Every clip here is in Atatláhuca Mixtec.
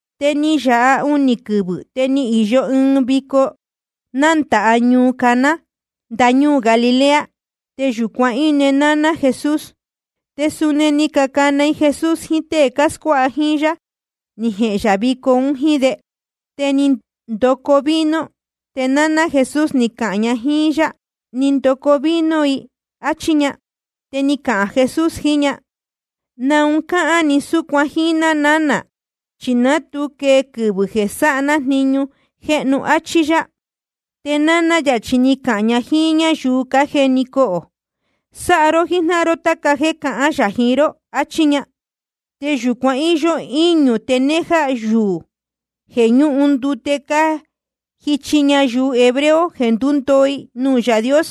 Te ni yāha unī quɨvɨ̄, te ni īyo ɨɨn vico nándāha ñuu Caná ndañúū Galilea. Te yūcuan íne náná Jesús. Te suni ni cacana i Jesús jiín tée cáscuáha jíín yá, ni jehēn yā vico un jíín de. Te ni ndoco vino. Te náná Jesús ni cahān ña jíín yá: Ni ndoco vino i, áchí ña. Te ni cahān Jesús jiín ña: ¿Naun cáhán ni súcuan jíín ná nánā? Chi ná tu quee quɨvɨ̄ jeē sáha ná jniñu jéhnu, áchí yá. Te náná yā chi ni cahān ña jíín ñáyuu cájeni cohō: Sáha ró jíjnáhan ró táca jéē cahān yā jiín ró. Achí ña. Te yūcuan íyó íñū tenéjá yuū jeē ñúhun ndute cájichi ñayuu hebreo jeē ndúndoo i nuū Yaā Dios.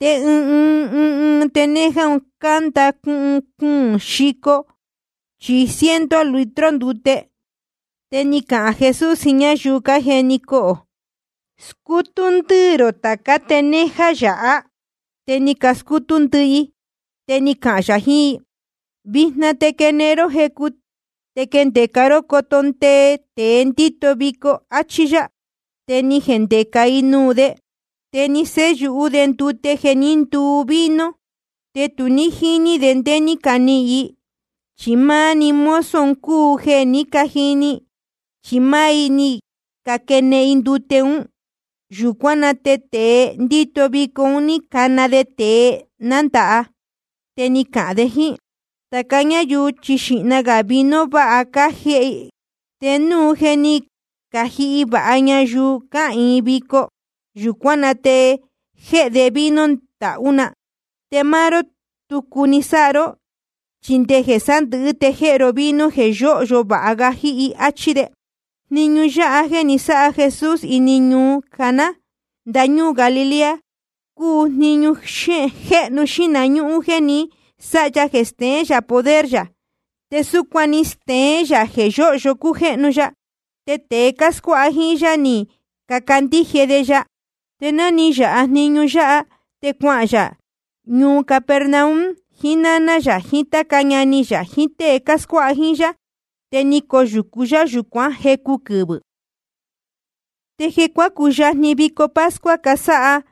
Te ɨɨn ɨɨn tenéjá un cánda cuhun cuūn xico chí ciento litro ndute. Te ni cahān Jesús jiín ñáyuu cájeni cohō: Scútú ndɨ́ɨ̄ rō tācá tenéjá yáha. Te ni cascútú ndɨ́ɨ̄ i. Te ni cahān yā jiín i: Vijna te quēen ró jecu te quindeca ró coto ndee tēe ndíto vico, áchí yá. Te ni cajendeca i nuū de. Te ni séyūhú de ndute jeē ní nduu vino, te tu jíní de ndé ní canihīn i. Chi máni mozo un cúu jeē cájini, chi máá i ni caquēen ndute ún. Yūcuán na te tēe ndíto vico ni cana de tēe nándāha. Te ni cahān de jíín: Tāca ñáyuu chi xīhna gā vino váha cájēhe i, te núu je ni cajihi vāha ñayuu cáhīin vico, yūcuán na te jéhe de vino ndahú na. Te máá ró tucu ni sáha ró, chi nde jeē sándɨ̄hɨ́ te jéhe ró vino jeē yóhyo vāha ga jíhi, áchí de. Jniñu yáha jéē ni sáha Jesús ini ñuu Caná ndañúū Galilea cúu jniñu jéhnu xīhna ñúhún jéē ni sáha ya jeē steén yā poder yā. Te súcuan ni steén yā jeē yóhyo cújéhnu ya. Te tēe cáscuáha jíín yá ni cacandíje de ya. Te ná ni yāha jniñu yáha, te cuahān yā ñuu Capernaum jiín náná yā jiín táca ñani yā jiín tée cáscuáha jíín yá. Te ni coyūcu yá yūcuán jecu quɨvɨ̄. Te jeē cuácuyajni vico pascua casáha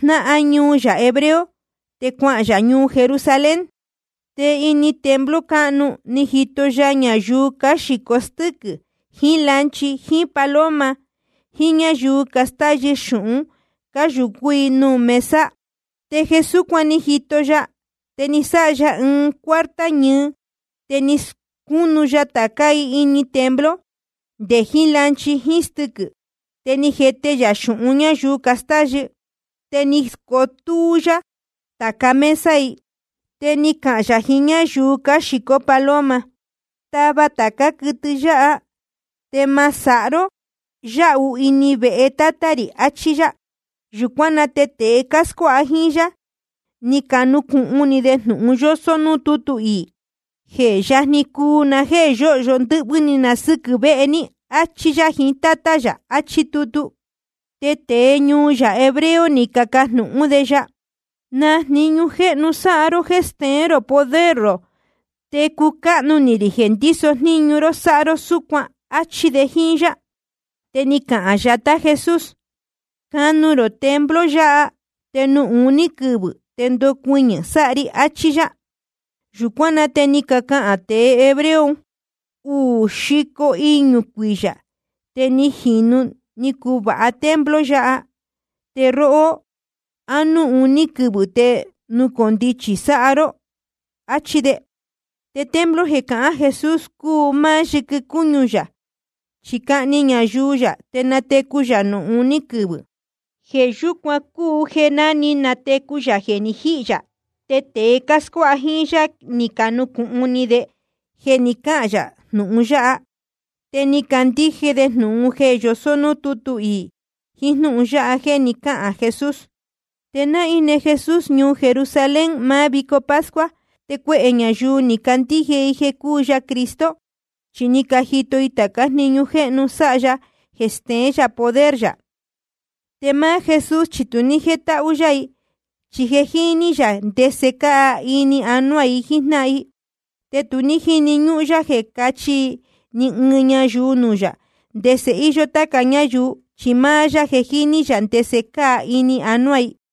jnáhan ñuu yā hebreo, te cuahān yā ñuu Jerusalén. Te ini templo cáhnu ni jito ya ñayuu cáxīcó stɨquɨ̄ jiín lanchi jíín paloma, jiín ñáyuu castáyɨ xūhun, cáyūcú i nuū mesa i. Te jeē súcuan ni jito ya, te ni sáha ya ɨɨn cuarta ñɨɨ. Te ni scúnu ya tācá i ini templo, nde jiín lanchi jíín stɨ́quɨ̄ i. Te ni jete yā xūhun ñáyuu castáyɨ. Te ni scotúú yá tāca mesa i. Te ni cahān yā jiín ñáyuu cáxīcó paloma: Tava tācá quɨtɨ yáha. Te ma sáha ró yáhu ini vehe Tátá rī. Achí yá. Yūcuán na te tēe cáscuáha jíín yá, ni canucūhun ni de jnūhun yósó núū tútu iī: Je yajni cuu na jéē yóhyo ndɨ́hvɨ́ ni na sɨ́quɨ̄ vehe ní, áchí yá jiín Tátá yā, achí tutu. Te tēe ñuu yā hebreo ni cacajnūhún de ya: ¿Na jniñu jéhnu sáha ró jéē steén rō poder rō, te cucáhnu ni rī jeē ndíso jníñu ró sáha ró súcuan? áchí de jíín yá. Te ni cahān yatá Jesús: Canu rō templo yáha, te nuū uní quɨvɨ̄ te nucondichi sáha ri, achí yá. Yūcuán na te ni cacahān tēe hebreo un: Uū xico iñū cuiyā te ni jīnu ni cuvāha templo yáha. Te róhó, ¿á núū uní‑ni quɨvɨ̄ te nucondichi sáha ró naún? Achí de. Te templo jeē cahán Jesús cúu máá yɨquɨ cúñu yā, chi cahni ñayuu yā te natecu yā nuū uní quɨvɨ̄. Jeē yúcuan cúu jeē ná ni natecu yā jeē ni jíhī yā, te tēe cáscuáha jíín yá ni canucūhun ni de jeē ni cáhān yā jnūhun yáha. Te ni cacandíje de jnūhun jeē yosó núū tútu iī, jiín jnúhun yáha jéē ni cáhān Jesús. Te ná íne Jesús ñuu Jerusalén máá vico pascua, te cuehē ñayuu ni cacandíje i jeē cúu ya Cristo, chi ni cajito i tācá jniñu jéhnu sáha ya jeē steén yā poder yā. Te máá Jesús chi tu ní jétáhú yá i, chi je jíní yā ndese cáa ini anuá i jíjnáhan i. Te tu jíni ñúhún yá jeē cáchi ni ɨɨn ñayuu nuū yā ndese íyó táca ñáyuu, chi máá yá je jíní yā ndese cáa ini anuá i.